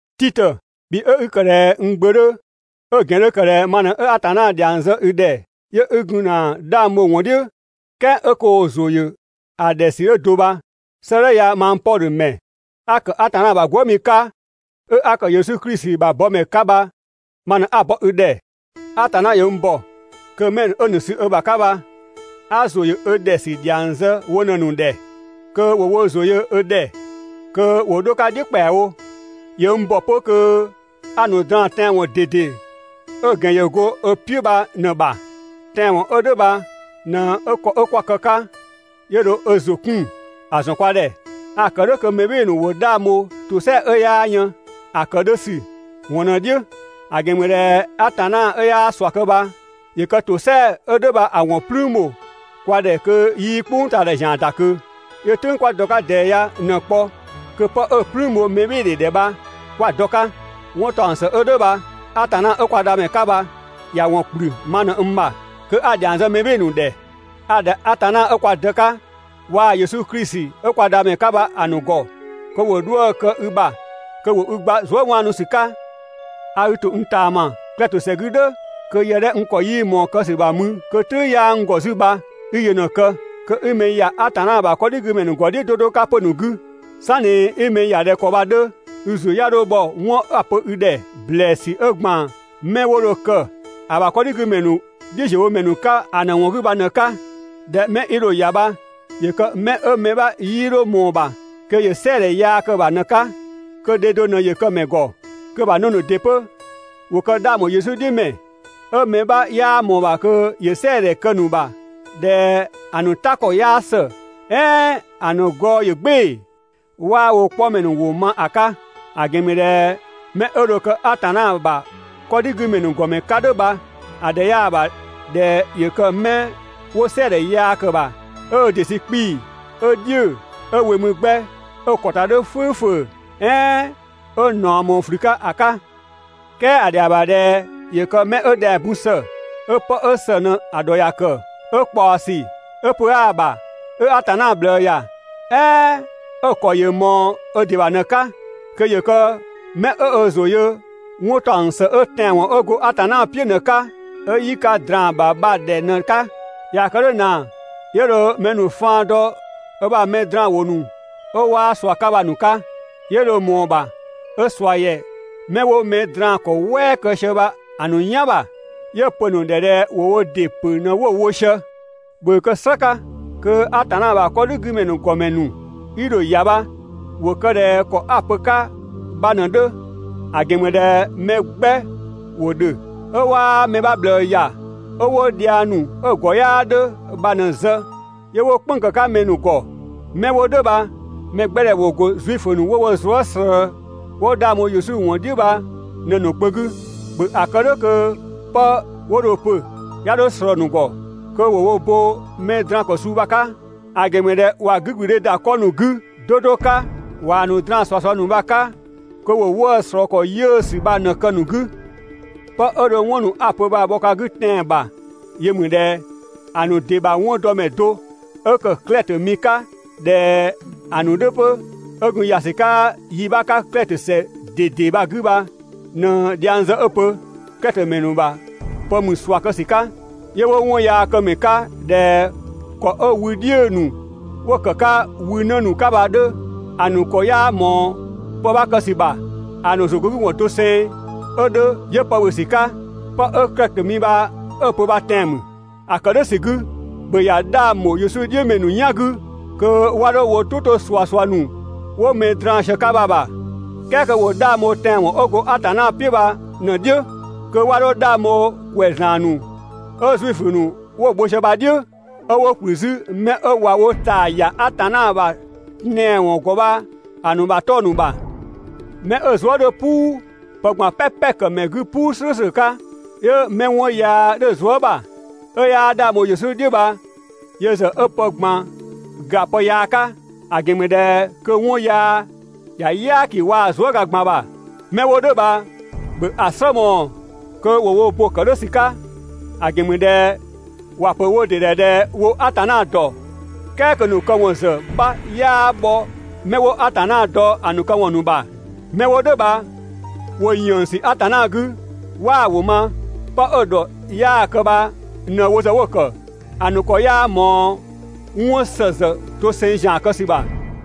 Titö, bhi 'ö 'i ‑kë ꞊dhɛ n gbö 'dhö, 'ö‑ ‑gɛn ‑kë ꞊dhɛ ma ꞊nɛ 'a Atanna ‑dhiang zë i ‑dhɛ 'yö 'i gun ‑na 'dhang bho‑ ‑wɔn "dhiʋ̈, "kɛɛ 'ö koo‑ ‑zʋ ‑yö ‑a ‑dhɛ ‑sü 'ö do bha, 'sëëdhɛ ya mang Pɔdhö ‑mɛ, 'a ‑kë Atanna ‑bha gwëëmi 'ka, 'ö 'a ‑kë Yesu klisi ‑bha bɔmɛ 'ka bha, ma ꞊në 'a‑ bɔ i ‑dhɛ. Atanna ‑yö n ‑bɔ kö 'mɛ ‑nu 'ö‑ ‑nu sü ö ‑bha 'ka bha 'a ‑zʋ ‑yö ö ‑dhɛ ‑sü ‑dhiang zë wo ꞊në‑ ‑nu ‑dhɛ kö ‑wo wo ‑zʋ yö ö ‑dhɛ kö ‑wo 'dho‑ 'ka "dhiʋ̈ ‑kpɛawo. ‑Yö n ‑bɔ 'pö kö 'a‑ ‑nu draan‑ tɛanwɔn ꞊dede 'ö‑ ‑gɛn ‑yö go ö "piʋ̈ bha ꞊në‑ ‑bha. Tɛanwɔn 'ö "dhʋ̈ bha ꞊në dho ‑kɔ 'ö 'kwa kë‑ 'ka 'yö dho ö ‑zʋ 'kun ‑a ‑zɔn kwa ‑dhɛ. A‑ ‑kë "dhʋ̈ kö mɛ "bhɩɩ‑ ‑nu ‑wo 'dhang bho ‑tosɛa 'ö 'yaa yën ‑a ‑kë 'dhö ‑sü ‑wɔn ꞊në‑ "dhiʋ̈. ‑A ‑gɛn ‑mü ꞊dhɛ Atanna 'ö 'yaa ꞊sua kë bha, ‑yö kë ‑tosɛa 'ö "dhʋ̈ bha‑ ‑wɔn "plüün ‑bho kwa ‑dhɛ kö 'yii "kpʋngtaadhɛ ‑zian ‑da ꞊kö. 'Yö "tʋ̈ng 'kwa dɔ‑ 'ka ꞊dɛɛ ya ꞊në‑ kpɔ kö 'pë 'ö‑ "plüün bho mɛbhɩɩdhe ‑dhɛ bha 'kwa‑ dɔ‑ 'ka. 'Wɔn ‑taɔng ‑së 'ö "dhʋ̈ bha Atanna 'ö kwa Dhamɛ 'ka bha ‑ya ‑wɔn ‑kplü ma ꞊në n ‑bha kö 'a‑ ‑dhiang zë mɛ ‑nu ‑dhɛ. A‑ ‑dhɛ Atanna 'ö kwa Dë 'ka, waa‑ Yesu Klisi 'ö kwa Dhamɛ 'ka bha‑ ‑nu ‑gɔ kö ‑wo 'dhuë‑ kë i ‑bha, kö ‑wo i gba zuëwaanusü 'ka. A i ‑to n ꞊taama Klɛtö ‑sɛ 'gü "dhʋ̈ kö yë 'dhɛ n ‑kɔ 'yii ꞊mɔɔ‑ kë ‑sü bha mü (kö "tʋ̈ng 'yaa n ‑gɔ 'zü bha) 'i yö ꞊në‑ kë. Kö 'i mɛ ‑ya Atanna ‑bha 'kɔdhigümɛ ‑nu ‑gɔ "dhiʋ̈ 'do 'do 'ka 'pö‑ ‑nu 'gü. "Sanni 'i mɛ ‑ya ꞊dhɛ ‑kɔ bha‑ 'dhö, i ‑zʋ 'ya 'dho bhɔ 'wɔn 'a‑ pö i ‑dhɛ ‑blɛɛsü 'ö ‑gban 'mɛ 'wo dho kë‑ ‑bha 'kɔdhigümɛ ‑nu "dhiʋ̈ziöwomɛ 'ka ‑a ‑nu ‑wɔn ‑bha bha ꞊në‑ 'ka. ꞊Dhɛ 'mɛ 'i dho‑ ‑ya bha ‑yö kë 'mɛ 'ö mɛ 'bha 'yii 'dho ꞊mɔɔ‑ ‑bha kö ‑yö "sɛɛdhɛ yaa kë‑ ‑bha ꞊në‑ 'ka, kö dhe do ꞊në ‑yö kë‑ ‑mɛ ‑gɔ, kö‑ ‑mɛ ‑bha 'në ‑nu ‑dɩ 'pö ‑wo kë 'dhang ‑bho Yesu "dhiʋ̈ ‑mɛ, 'ö mɛ 'bha 'yaa ꞊mɔɔ‑ ‑bha kö ‑yö "sɛɛdhɛ kë‑ ‑nu ‑bha ꞊dhɛ ‑a ‑nu "ta ‑kɔ 'yaa ‑së, "ɛɛn ‑a ‑nu gɔɔ ‑yö "gbɩɩ‑, 'waa wo 'kpɔmɛ ‑nu ‑wʋ ma ‑a 'ka. ‑A ‑gɛn ‑mü ꞊dhɛ 'mɛ 'ö dho kë Atanna ‑bha 'kɔdhigümɛ ‑nu ‑gɔmɛ 'ka "dhʋ̈ bha‑ ‑dhɛ 'yaa‑ ‑bha ꞊dhɛ ‑yö kë 'mɛ 'wo "sɛɛdhɛ yaa ‑kë ‑bha, 'ö ö ‑dɩ sü 'kpii‑, 'ö "dhiʋ̈‑, 'ö we mü 'gbɛ, 'ö‑ ‑kɔ ‑ta 'dhö "fʋ̈ʋ̈fʋ̈ʋ̈ "ɛɛn 'ö ꞊naɔ ꞊mɔɔ ꞊flü 'ka ‑a 'ka. "Kɛɛ ‑a ‑dhɛa ‑bha ꞊dhɛ ‑yö kë 'mɛ 'ö ‑dhɛng bun ‑së, 'ö 'pë 'ö ‑së ꞊në ‑dhɔ ‑ya ‑kë, 'ö ꞊kpaɔsü, 'ö pö 'aa‑ ‑bha, 'ö Atanna ꞊bhlëë ‑ya, "ɛɛn 'ö‑ ‑kɔ ‑yö ꞊mɔɔ ö ‑dɩ ‑bha ꞊në‑ 'ka. Kö ‑yö kë 'mɛ 'ö ö ‑zʋ yö 'wɔn ‑taɔng ‑së 'ö tɛanwɔn 'ö go Atanna "piʋ̈ ꞊në‑ 'ka, 'ö 'yi ka ꞊draan‑ ‑bha bha‑ ‑dhɛ ꞊në‑ 'ka. ꞊Yaa‑ kë "dhʋ̈ ꞊naa 'yö dho mɛ ‑nu faan dɔ ö ‑bha mɛ draanwʋ ‑nu 'ö 'waa ꞊sua 'ka bha‑ ‑nu 'ka, 'yö dho ꞊mɔɔ‑ ‑bha 'ö ꞊sua ‑yɛ 'mɛ 'wo mɛ draan‑ ‑kɔ "wɛɛ kë sië bha‑ ‑nu "yan ‑bha, 'yö‑ pö‑ ‑nu ‑dhɛ ꞊dhɛ ‑wo wo ‑dɩ ‑pö ꞊në 'wo‑ wo sië. (‑Bhö ‑a kë "slë 'ka kö Atanna ‑bha 'kɔdhigümɛ ‑nu ‑gɔmɛ ‑nu 'i dho‑ ‑ya bha ‑wo kë ꞊dhɛ ‑kɔ a‑ pö‑ 'ka bha ꞊në‑ 'dhö), ‑a ‑gɛn ‑mü ꞊dhɛ mɛ 'gbɛ ‑wo ‑dhö 'ö 'waa mɛ 'bha ꞊bhlëë ‑ya, 'ö 'wo dhiang ‑nu 'ö‑ ‑gɔ 'yaa 'dhö bha ꞊në‑ zë 'yö 'wo "kpënng‑ ‑kë 'ka mɛ ‑nu ‑gɔ. 'Mɛ 'wo "dhʋ̈ bha‑ mɛ 'gbɛ ‑dhɛ ‑wo ‑go Zuifö ‑nu 'wo wo zuë" ꞊slëë 'wo 'dhang bho Yesu ‑wɔn "dhiʋ̈ bha ꞊në‑ ‑nu kpö 'gü. ‑Bhö ‑a kë "dhʋ̈ kö 'pë 'wo dho‑ pö 'ya 'dho ꞊slɔɔ‑ ‑nu ‑gɔ, kö ‑wo wo bo mɛ draan‑ ‑kɔ suu bha‑ 'ka, ‑a ‑gɛn ‑mü ꞊dhɛ ꞊wa 'gügblüdhe ‑da 'kɔ ‑nu 'gü 'do 'do 'ka ꞊waa‑ ‑nu ꞊draan ꞊suasua ‑nu bha‑ ‑nu 'ka kö 'wo 'wëë‑ ꞊slɔɔ ‑kɔ 'yiʋ̈‑ ‑sü bha ꞊në‑ kë‑ ‑nu 'gü. ('Pë 'ö dho 'wɔn ‑nu 'a‑ pö bha‑ ‑nu bhɔ ka 'gü tɛan‑ ‑bha yö ‑mü ꞊dhɛ) ‑a ‑nu ‑dɩ ‑bha 'wɔndɔmɛ do 'ö ‑kë Klɛtö mi 'ka ꞊dhɛ‑ ‑nu 'dhö 'pö, 'ö gun ‑ya ‑sü 'ka yi 'bha 'ka Klɛtö ‑sɛ ꞊dede bha‑ 'gü bha ꞊në dhiang zë 'ö‑ pö: «Klɛtö ‑mɛ ‑nu ‑bha pë ‑mü ꞊sua kë ‑sü 'ka, 'yö 'wo 'wɔnyaakëmɛ 'ka ꞊dhɛ ‑kɔ 'ö wü "dhiʋ̈‑ ‑nu 'wo‑ ‑kë 'ka wü 'në ‑nu 'ka bha‑ 'dhö. ‑A ‑nu ‑kɔ 'yaa ꞊mɔɔ pë 'bha kë ‑sü ‑bha. ‑A ‑nu ‑zʋgɔngüwɔn doseng 'ö 'dhö 'yö pë ‑bhö ‑sü 'ka.» Pë 'ö Klɛtö mi bha 'ö‑ pö bha tɛan‑ mü. ‑A ‑kë "dhʋ̈ ‑sü 'gü, ‑bhö ‑ya 'dhang ‑bho Yesu "dhiʋ̈ ‑mɛ ‑nu "yan 'gü kö 'wa 'dho wo "tʋ 'to ꞊suasua ‑nu 'wo mɛ ‑nu draan‑ sië‑ 'ka bha‑ ‑bha, "kɛɛ kö ‑wo 'dhang bho tɛanwɔn 'ö go Atanna "piʋ̈ bha ꞊në‑ "dhiʋ̈. Kö 'wa 'dho 'dhang bho ‑kwɛzlan ‑nu 'ö Zuifö ‑nu 'wo‑ bho sië bha‑ "dhiʋ̈, 'ö 'wo ‑kplü 'zü 'mɛ 'ö ꞊wa wo ꞊taa ‑ya Atanna ‑bha tɛanwɔn ‑gɔ bha‑ ‑nu ‑bha 'tɔng‑ ‑nu ‑bha. 'Mɛ 'ö‑ zuë" 'dhö "puu, pë ꞊gban "pɛpɛ‑ ‑kë ‑mɛ 'gü "puu "slʋ̈ʋ̈slʋ̈ 'ka, 'yö 'mɛ 'wɔn yaa 'dhö‑ zuë" ‑bha, 'ö 'yaa 'dhang bho Yesu "dhiʋ̈ bha yö ‑zë 'ö pë ꞊gban ‑ga pë yaa 'ka, ‑a ‑gɛn ‑mü ꞊dhɛ kö 'wɔn yaa ‑ya "yaaki waa‑ zuëga ꞊gban ‑bha. ('Mɛ 'wo "dhʋ̈ bha ‑bhö ‑a "slë mɔɔ‑ kö ‑wo wo bo‑ ‑kë "dhʋ̈ ‑sü 'ka; ‑a ‑gɛn ‑mü ꞊dhɛ) ‑wa ‑pö ‑wo ‑dɩ ‑dhɛ ꞊dhɛ wo Atanna ‑dɔ, "kɛɛ kö‑ ‑nu këwɔn ‑zë 'bha 'yaa bhɔ 'mɛ 'wo Atanna dɔ‑ ‑nu këwɔn ‑nu ‑bha. 'Mɛ 'wo "dhʋ̈ bha ‑wo ‑yënngsü Atanna 'gü, 'waa‑ ‑wʋ ma, 'pë 'ö‑ ‑dhɔ 'yaa‑ kë bha ꞊në wo ‑zë 'wo‑ ‑kë. ‑A ‑nu ‑kɔ 'yaa ꞊mɔɔ 'wɔn ‑së ‑zë doseng ‑zian kë ‑sü ‑bha.